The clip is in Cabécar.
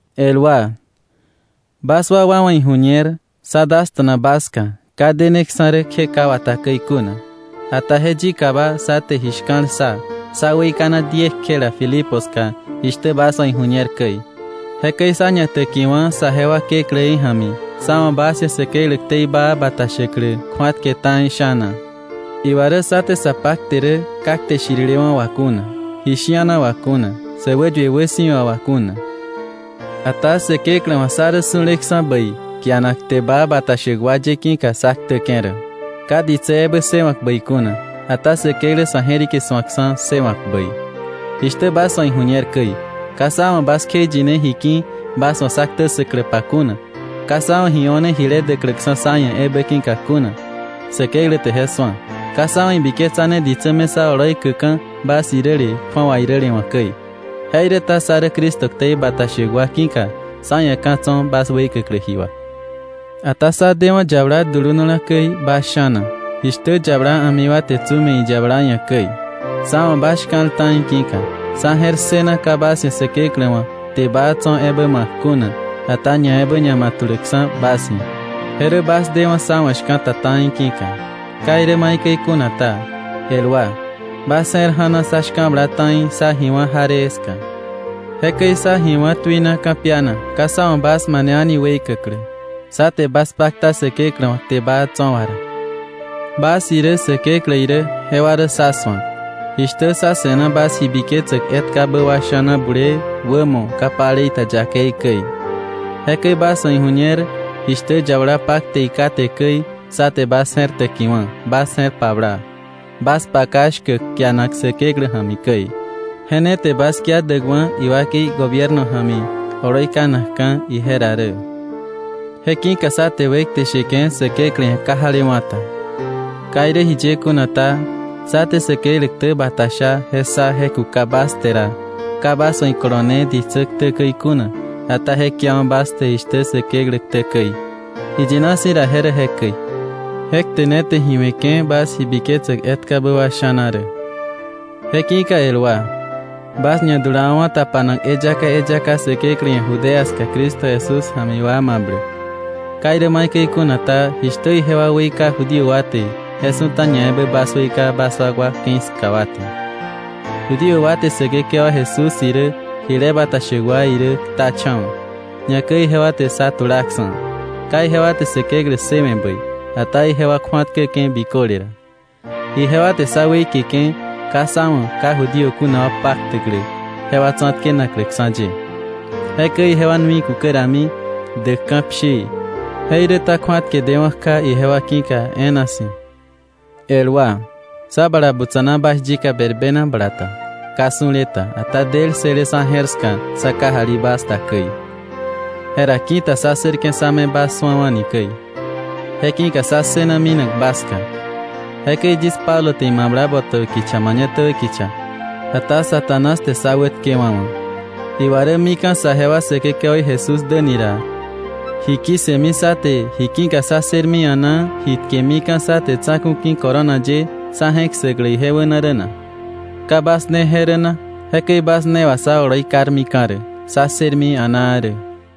El wa, bas wakwa wa̱ iju̱ñer, sá dasta̱na bas ska ka deneksa̱ rä kje ka wata käi kuna. Ata je yikaba sá te ji shka̱l ssa, sá weikana diekjela Filipo ska jishtä bas wa̱ iju̱ñer käi. Jekäi sá ñatäkiwa̱ saje wa Kekläí ja̱mi sá wa̱ bas ia̱ Säkeklä ktei baa bata shäklä kju̱atke ta̱i sha̱na. Iwa rä sá te sa pakte rä ka kte shirilewa̱ wà kuna, ji shi̱ana wà kuna, sä wäyue wäsi̱wa wà kuna. Ata Säkeklä wa̱ sá rä su̱leksa̱ bäi kianak kte baa bata shäk wa ye ki̱ka sá ktäke̱ rä, ka ditsä ebä ssëwa̱k bäi kuna, ata Säkeklä sa̱ je̱rike su̱akksa̱ ssëwa̱k bäi. Jishtä bas wa̱ iju̱ñer käi, ka sá wa̱ bas kjeiyine ji ki̱ bas wa̱ sá ktä ssäkläpa kuna, ka sá wa̱ ji o̱ne jile däkläksa̱ sá ia̱ ebä ki̱ka kuna. Säkeklä te je su̱a. Ka sá wa̱ ibiketsane ditsä me sá oloi käka̱, bas iräle kju̱awa iräle wa̱ käi. Jeiräta sá rä Cristo ktei bata shäk wa ki̱ka, sá ia̱ ka̱ tso̱ bas weikäklä ji wà. Ata sá dewa̱ yabala dulunala käi bas sha̱na. Jishtä yabala a̱mi wa te tsu me̱ iyabala ia̱ käi, sá wa̱ bas shka̱l ta̱i ki̱ka, sá je̱r ssëna ka bas ia̱ Säkeklä wa̱ kte baa tso̱ ebä ma̱k kuna, ata ñaebä ñama̱tuläkksa̱ bas ia̱, je rä bas dewa̱ sá wa̱ shka̱ta ta̱i ki̱ka. Ka irä maikäi kuna ta, el wa, bas je̱r ja̱na sá shka̱bla ta̱i sá ji wá̱ jaree ska. Jekäi sá ji wá̱ tuina ka̱piana, ka sá wa̱ bas mane a̱ni weikäklä, sá te bas pakta Säkeklä wa̱ kte baa tso̱ wa ra. Bas irä, Säkeklä irä, jewa rä sá su̱ak, jishtä sá se̱na bas ji biketsäk etkabä wa sha̱na bulee, wämo, ka palei ta yakei käi. Jekäi bas wa̱ iju̱ñer jishtä yabala pakte iká te käi, sá te bas je̱r täkiwa̱, bas je̱r pabla, bas paka shkäk kianak Säkeklä ja̱mi käi. Je ne te bas kia däkwa̱ iwakei gobierno ja̱mi oloi kanakka̱ ije ra. Je ki̱ka sá te wekte sheke̱ Säkeklä ia̱ ka jalewa̱ ta. Ka irä jiye kuna ta, sá te Säkeklä ktä bata sha je ssa je kuka bas te ra, ka bas wa̱ ikolone ditsä ktä käi kuna, ata je kiawa̱ bas te jishtä Säkeklä ktä käi. Iyina si̱ ra je rä jekäi. Je kte ne te ji we̱ke̱ bas ji biketsäk etkabä wà sha̱na rä. Jeki̱ka el wa, bas ñadulawa̱wa̱ tapanak eyaka eyaka Säkeklä ia̱ Judea ska Cristo Jesús ja̱mi wa mabläk. Ka irä maikäi kuna ta, jishtä ijewa weika Judío wa te, je su̱ta ñaebä bas weika bas wakwa ke̱i ska wa te. Judío wa te Säkekewa Jesús irä jile bata shäk wa irä ktacha̱wa̱, ñakäi ijewa te sá tulaksa̱. Ka ijewa te Säkeklä ssëwe̱ bäi, ata ijewa kju̱atkäke̱ biköle ra. Ijewa te sá wätkewe̱ke̱ ka sá wa̱ ka Judío kuna wa paktäklä jewa tsa̱tkenakläksa̱ ye. Jekäi ijewa nui kukä rami däka̱ pshii. Jeiräta kju̱atke dewa̱ kja ijewa ki̱ka e̱e̱na si̱. El wa, sá bala butsa̱na bas yika berbena bala ta, ka su̱le ta, ata del ssële sa̱ je̱r ska sá kajali bas da käi, jera ki̱ta sá ssërke̱ sa̱ me bas su̱awa̱ni käi. Je ki̱ka sá ssëna minak bas ska. Jekäi yis Pablo te imabla botäbä kicha mañatäbä kicha, ata Satanás te sá wätkewa̱wa̱. Iwa rä mika̱ saje wa Säkekewaí Jesús däni ra, ¿ji ki̱ssëmi sá te, ji ki̱ka sá ssërmi a̱naa, ji tkemika̱ sá te tsa̱ku̱ ki̱ corona ye sá je̱k ssäklä ije wäna rä na? ¿Ka bas ne je rä na? Jekäi bas ne wà sá oloi karmika̱ rä, sá ssërmi a̱naa rä.